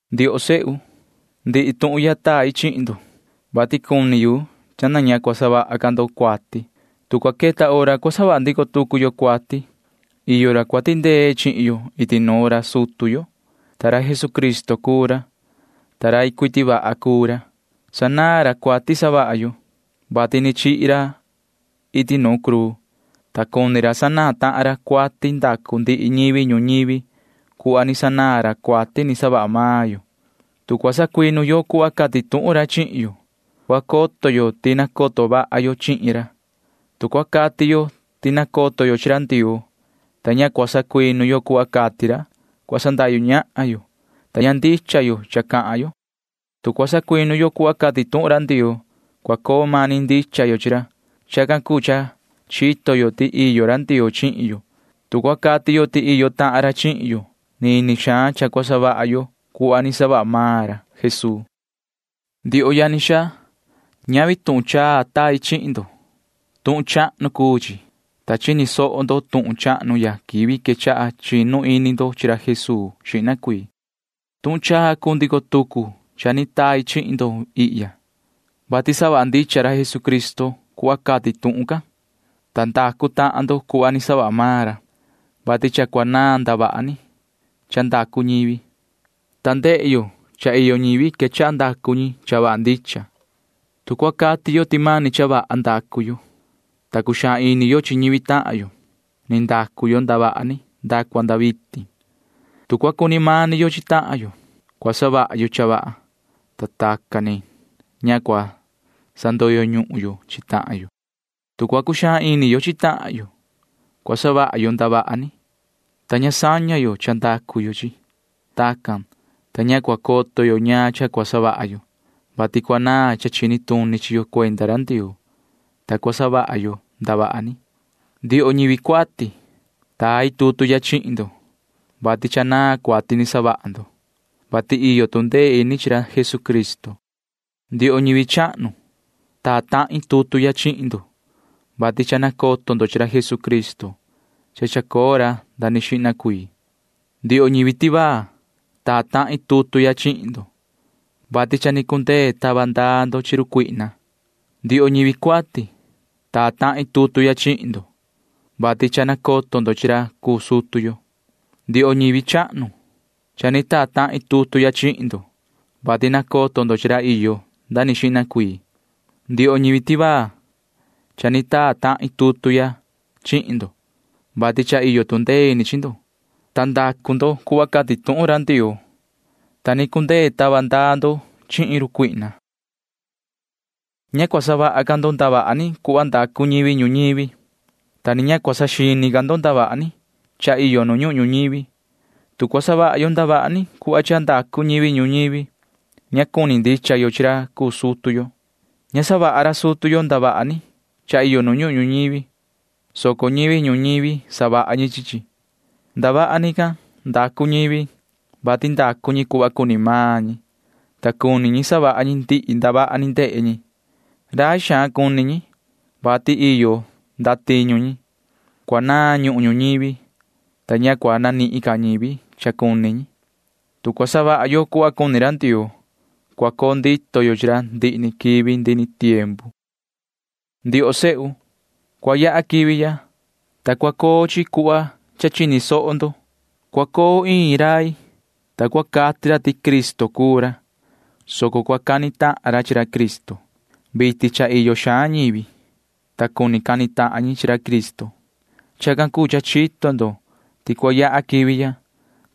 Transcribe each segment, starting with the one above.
Ndioho sehu, ndihi tuhun ya tai chihin ndo, vati cuni yu cha ña cua savaha ca ndo cuati. Tu cua queta hora cua savaha ndico tucu yo cuati, iyo ra cua tindee chihin yo iti nuun ra sutu yo. Jesucristo cuu ra, ta rai cuiti vaha cuu ra. Sanaan ra cuati savaha yo, vati ni chihi ra iti nu cruu, ta cuni ra sanaan tahan ra cuati ndacu ndihi ñivi ñuñivi cuhva ni sanaan ra cuati ni savaha maan yo. Tu cua sacuinu yo cuhva cati tuhun ra chihin yo, cua coto yo ti nacoto vaha yo chihin ra. Tu cua cati yo ti nacoto yo chi ra Ndioo, ta ña cua sacuinu yo cuhva cati ra, cua sandahyu ñahan yo, ta ña ndicha yo cha cua cahan yo. Tu cua sacuinu yo cuhva cati tuhun ra Ndioo, cua coo mani ndicha yo chi ra. Chacan cuu cha chito yo ti iyo ra Ndioo chihin yo. Tu cua cati yo ti iyo tahan ra chihin yo, nini xaan cha cua savaha yo cuhva ni savaha maan ra Jesuu. Ndioho yani xaa, ñavi tuhun chaa tai chihin ndo. Tuhun chahnu cuu chi, ta chini soho ndo tuhun chahnu ya quivi quechaha chinu ini ndo chi ra Jesuu xihna cuii. Tuhun chaa cuu ndico tucu cha ni tai chihin ndo ihya, vati savaha ndicha ra Jesucristo cuhva cati tuhun can, ta ndacu tahan ndo cuhva ni savaha maan ra, vati cha cua naan ndavaha ni cha ndacu ñivi, ta ndehe yo cha iyo ñivi quechaha ndacu ñi cha vaha ndicha. Tu cua cati yo ti mani cha vaha ndacu yo, ta cuxaan ini yo chi ñivi tahan yo, ni ndacu yo ndavaha ni nda cua nda vitin. Tu cua cuni mani yo chi tahan yo, cua savaha yo cha vaha, ta tacan ni ña cua sandoyo ñuhun yo chi tahan yo. Tu cua cuxaan ini yo chi tahan yo, cua savaha yo ndavaha ni, ta tacan ni ña saña yo ndavaha ni savaha yo. Tacan cuu, ta ña cua coto yo ñaan cha cua savaha yo, vati cua naan cha chini tuni chi yo cuenda ra Ndioo, ta cua savaha yo ndavaha ni. Ndioho ñivi cuati, tai tutu ya chihin ndo, vati cha naan cuati ni savaha ndo, vati iyo tu ndee ini chi ra Jesucristo. Ndioho ñivi chahnu, taa tahin tutu ya chihin ndo, vati cha nacoto ndo chi ra Jesucristo ra iyo nda ni xihna cuii. Ndioho ñivi tivaa, taa tahin tutu ya chihin ndo, vati cha ni cundee tava ndaa ndo chi run cuihna. Ndioho ñivi cuati, taa tahin tutu ya chihin ndo, vati cha nacoto ndo chihin ra cuu sutu yo. Ndioho ñivi chahnu, cha ni taa tahin tutu ya chihin ndo, vati nacoto ndo chihin ra iyo nda ni xihna cuii. Ndioho ñivi tivaa, cha ni taa tahin tutu ya chihin ndo, vati cha iyo tu ndee ini chihin ndo, ta ndacu ndo cuhva cati tuhun Ndioo, ta ni cundee tava ndaa ndo chihin run cuihna. Ña cua savaha ca ndo ndavaha ni cuhva ndacu ñivi ñuñivi, ta ni ña cua saxini ca ndo ndavaha ni cha iyo nu ñuhun ñuñivi. Tu cua cuni savaha yo ndavaha ni cuhva cha ndacu ñivi ñuñivi, ña cua cuni ndicha yo chi ra cuu sutu yo. Ña savaha ra sutu yo ndavaha ni cha iyo nu ñuhun ñuñivi, soco ñivi ñuñivi savaha chi chi. Ndavaha ni can ndacu ñivi, vati ndacu ñi cuhva cuni maan ñi, ta cuni ñi savaha ñi ndihi ndavaha ni ndehe ñi. Rai xaan cuni ñi, vati iyo ndatiñu ñi. Cua naan ñuhun ñuñivi, ta ña cua nanihin ca ñivi cha cuni ñi. Tu cua savaha yo cuhva cuni ra Ndioo, cua coo ndito yo chi ra ndihi ni quivi ndihi ni tiempu. Ndioho sehu, cua yaha quivi ya, ta cua coo chi cuhva cha chini soho ndo. Cua coo iin rai, ta cua cati ra ti Cristo cuu ra, soco cua cani tahan ra chi ra Cristo. Vitin cha iyo xaan ñivi, ta cuni cani tahan ñi chi ra Cristo. Chacan cuu cha chito ndo ti cua yaha quivi ya,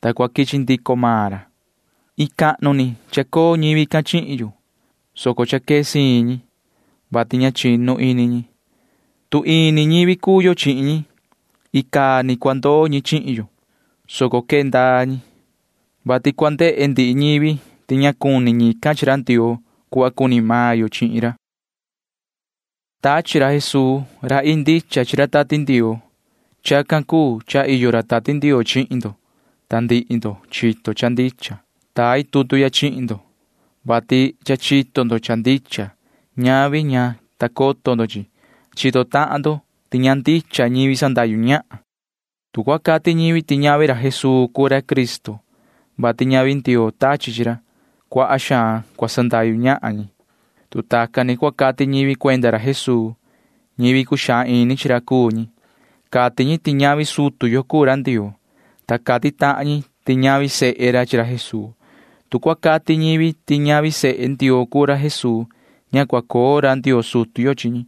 ta cua quichi ndico maan ra. Iin cahnu ni chacoo ñivi can chihin yo, soco cha quee siin ñi, vati ña ndicha ñi. Tu ini ñivi cuu yo chihin ñi, icaa ni cua ndoo ñi chihin yo, soco quee ndaa ñi, vati cua ndehe ndihi ñivi ti ña cuni ñican chi ra Ndioo cuhva cuni maan yo chihin ra. Tachi ra Jesuu ii chi ra Tati Ndioo. Chacan cuu cha iyo ra Tati Ndioo chihin ndo, ta ndihi ndo chito cha ndicha. Tai tutu ya chihin ndo, vati cha chito ndo cha ndicha, ta ñavi ti cumani coto ndo cha ndicha. Chito tahan ndo ti ña ndicha ñivi sandahyu ñahan. Tu cua cati ñivi ti ñavi ra Jesuu cuu ra Cristo, vati ñavi Ndioo tachi chi ra, cuaha xaan cua sandahyu ñahan ñi. Tu tacan ni cua cati ñivi cuenda ra Jesuu, ñivi cuxaan ini chi ra cuu ñi. Cati ñi ti ñavi sutu yo cuu ra Ndioo, ta cati tahan ñi ti ñavi sehe ra chi ra Jesuu. Tu cua cati ñivi ti ñavi sehe Ndioo cuu ra Jesuu, ña cua coo ra Ndioo sutu yo chi ñi.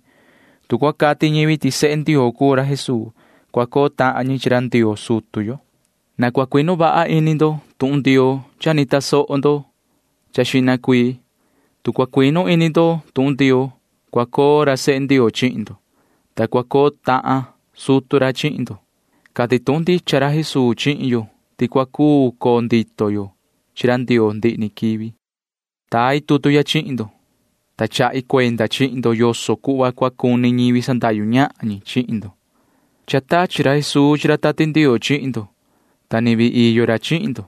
Tu cua cati ñivi ti sehe Ndioo cuu ra Jesuu, cua coo tahan ñi chi ra Ndioo sutu yo. Na cua cuinu vaha ini ndo tuhun Ndioo cha ni tasoho ndo xihna cuii. Tu cua cuinu ini ndo tuhun Ndioo, cua coo ra sehe Ndioo chihin ndo, ta cua coo tahan sutu ra chihin ndo. Cati tuhun ndicha ra Jesuu chihin yo ti cua cuu coo ndito yo chi ra Ndioo ndihi ni quivi. Tai tutu ya chihin ndo, ta chahi cuenda chihin ndo yoso cuhva cua cuni ñivi sandahyu ñahan ñi chihin ndo. Cha tachi ra Jesuu chi ra Tati Ndioo chihin ndo, ta ni vii iyo ra chihin ndo.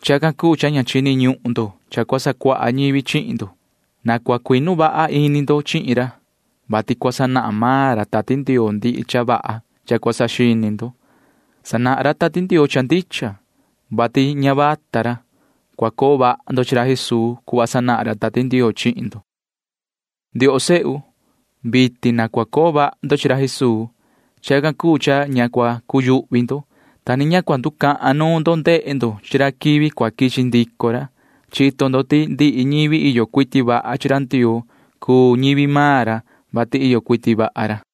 Chacan cuu cha ña chini ñuhun ndo cha cua sacuaha ñivi chihin ndo. Na cua cuinu vaha ini ndo chihin ra, vati cua sanahan maan ra Tati Ndioo ndihi cha vaha cha cua saxini ndo. Sanahan ra Tati Ndioo cha ndicha, vati ña vata ra. Cua coo vaha ndo chi ra Jesuu cuhva sanahan ra Tati Ndioo chihin ndo. Ndioho sehu, vitin na cua coo vaha ndo chihin ra Jesuu. Chacan cuu cha ña cua cuyuhvi ndo, ta ni ña cua nducahan nuun ndo ndehe ndo chi ra quivi cua quichi ndico ra. Chito ndo ti ndihi ñivi iyo cuiti vaha chi ra Ndioo cuu ñivi maan ra, vati iyo cuiti vaha ra.